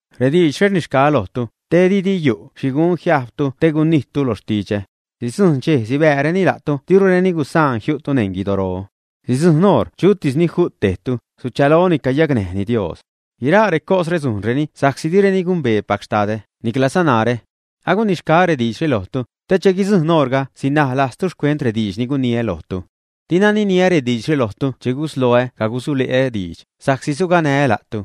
’Rediidxre rnixgaä lojtu, te didi yu' xhi gun jiajbtu te gunijttu lo xtidxä. Sidzujṉ dxej sibääreni la'tu dirureni gusaan jiu'tu neṉ guidoro. Sidzujṉ oṟ chutis ju't tejtu, suchaloni cayacnäjni Dios. Guiraa recosre sujnreni sa'csi direni gumbeepac Xtadä, niclaza narä. Agunixgaä rediidxre lojtu, te che guidzujṉ oṟga sinaj lajztu xcuent rediidx ni guniä lojtu. ’Dina niniä rediidxre lojtu che gusloä cagusule'ä diidx, sa'csi suganää́ la'tu.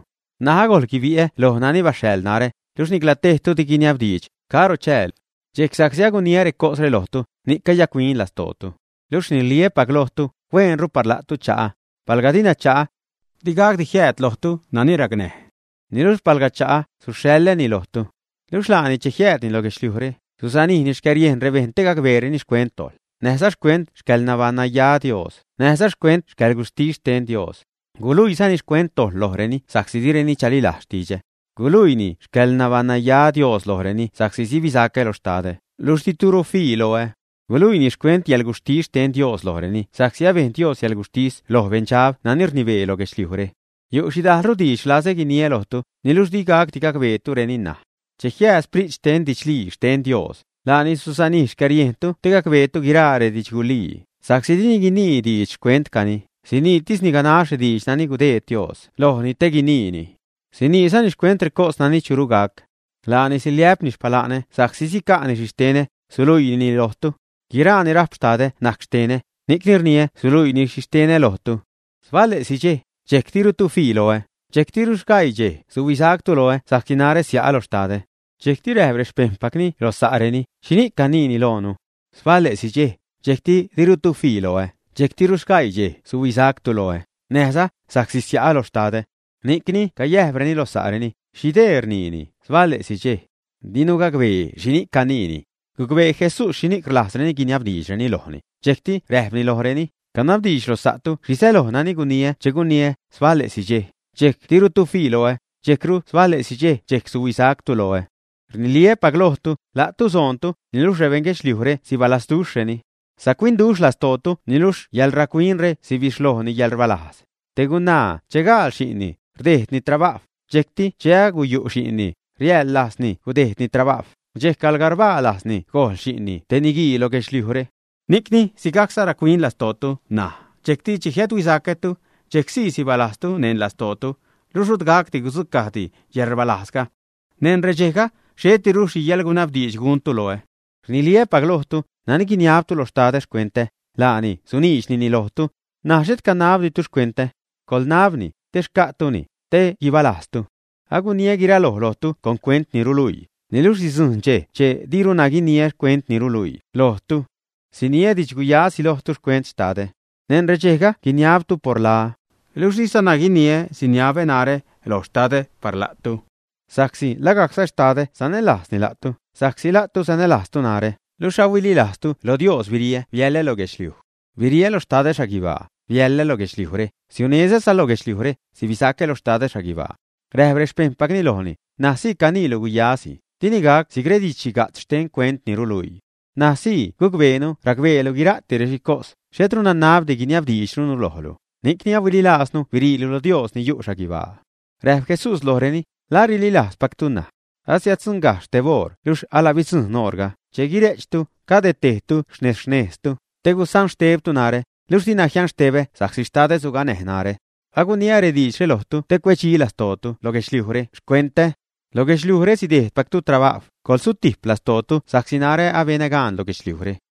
N̲aj agojl guibi'ä loj nani baxhaḻ narä, luxh nicla tejtu di guiniabdiidx: “¿Caro chäälu?” Dxejc sa'csi aguniä recosre lojtu, ni'c cayac-huin lastootu. Luxh rniliä́pac lojtu, hueenru par la'tu cha'ä. Palga dina cha'ä, di gacdi jiääd lojtu nani racnäj. Niluxh palga cha'ä, suxhaḻäni lojtu. Luxh laani, che jiäädni lo guedxliujre, susanijni xcäriejn rebejṉ te gacbeereni xcuent dojḻ, näjza xcuent xcäḻnabaṉnaya Dios, näjza xcuent yäḻguxhtis xten Dios. Guluiizani xcuent dojḻ lojreni sa'csi direni chalilajz xtidxä. Guluiini xcäḻnabaṉnaya Dios lojreni sa'csi sibisacä lo Xtadä, luxh dirutu fii loä. Guluiini xcuent yäḻguxhtis xten Dios lojreni sa'csi abejn Dios yäḻguxhtis loj beṉdxab nani rnibee lo guedxliujre. ’Yu' xhidajlru diidx rlazä guiniä lojtu, niluxh digacdi gacbeetureni ṉaj. Che jiääd Sprit xten didxlii xten Dios, laani susanijni xcäriejntu te gacbeetu guiraa redidxgulii, sa'csi dini guinii diidx xcuentcani, siniitisni ganax rediidx nani gudeed Dios lojni te guiniini. Siniizani xcuent recos nani churu gac. Laani siliä'pni xpala'nä sa'csi sica'ni xhixtenä, suluiinini lojtu. Guiraa ni rajp Xtadä najc xtenä, ni'cni rniä suluiini xhixtenä lojtu. ’Sbale'si dxej, dxejc dirutu fii loä; dxejctiru sgaii dxej suhuisactu loä sa'csi narä sia'a lo Xtadä. Dxejcti räjp rexpejṉpacni lo sa'reni: ―¿Xhini'c caniini loonu? Sbale'si dxej, dxejc dirutu fii loä, dxejctiru sgaii dxej suhuisactu loä, näjza: sa'csi sia'a lo Xtadä. Ni'cni cayäjpreni lo sa'reni: ¿Xhi dee rniini, “sbale'si dxej”? Dinu gacbee xhini'c caniini. Gucbee Jesús xhini'c rlajzreni guiniabdiidxreni lojni, dxejcti räjpni lojreni: ―Canabdiidx lo sa'tu xhi säloj nani guniä che guniä, sbale'si dxej, dxejc dirutu fii loä; dxejcru sbale'si dxej, suhuisactu loä. Rniliä́pac lojtu, la'tu soontu, niluxh rebeṉ guedxliujre sibalazduxhreni. Sac-huinduxh lastootu niluxh yäḻrac-huinre sibixhlojni yäḻrbalajz. Te gunaa che gaal xi'nni, rdejdni trabajw, dxejcti che aguyu' xi'nni, riäḻ lajzni gudejdni trabajw, dxejc arbaa lajzni gojl xi'nni te niguii lo guedxliujre. Ni'cni, sigajcza rac-huin lastootu ṉaj, dxejcti che jiädhuisacätu, dxejc sii sibalajztu neṉ lastootu, luxh rut gacdi gudzucajdi yäḻrbalajzga. ’Neṉ redxejga xhetiru xhi yäḻguiniabdiidxdi guntu loä. Rniliä́pac lojtu, nani guiniabtu lo xtadä xcuentä, laani suniidxnini lojtu. N̲aj xhet canabditu xcuentä. Coḻnabni, te xca'tuni, te guibalajztu. ’Aguniä guiraloj lojtu con cuent ni ruluii, niluxh sidzujṉ dxej che diruna guiniä cuent ni ruluii lojtu. Siniä didxguyasi lojtu xcuent Xtadä. Neṉ redxejga guiniabtu por laä. Luxh dizana guiniä siniabä narä loj Xtadä par la'tu, sa'csi lagajcza Xtadä sanälajzni la'tu, sa'csi la'tu sanälajztu narä, luxh ahuililajzzatu loj Dios biriä biälä lo guedxliuj. Biriä lo Xtadä xhaguibaa, biäḻä lo guedxliujre, siunezäza lo guedxliujre, sibisacä lo Xtadä xhaguibaa. Räjp rexpejṉpacni lojni: ―N̲aj sii caniilu guyasi, dini gac si'c redidx-xhiga'tz xten cuent ni ruluii. N̲aj sii gucbeenu racbeelu guira'ti rexhicos, xhetru nanabdi guiniabdiidxrunu lojlu; ni'cni ahuililajznu biriilu lo Dios ni yu' xhaguibaa. Räjp Jesús lojreni: ―¿La rililajzpactu ṉaj, ä? Asiäddzuṉgajxh teb oṟ luxh ala bidzujṉ oṟga, che guire'chtu, cade tejtu xnez-xnejztu, te gusanxtebtu narä, luxh dina jianxtebä sa'csi Xtadä suganäj narä. Aguniä rediidxre lojtu te cuedxi lastootu lo guedxliujre xcuentä. Lo guedxliujre sidejdpactu trabajw, coḻgusutijp lastootu sa'csi narä abenä gaan loj guedxliujre.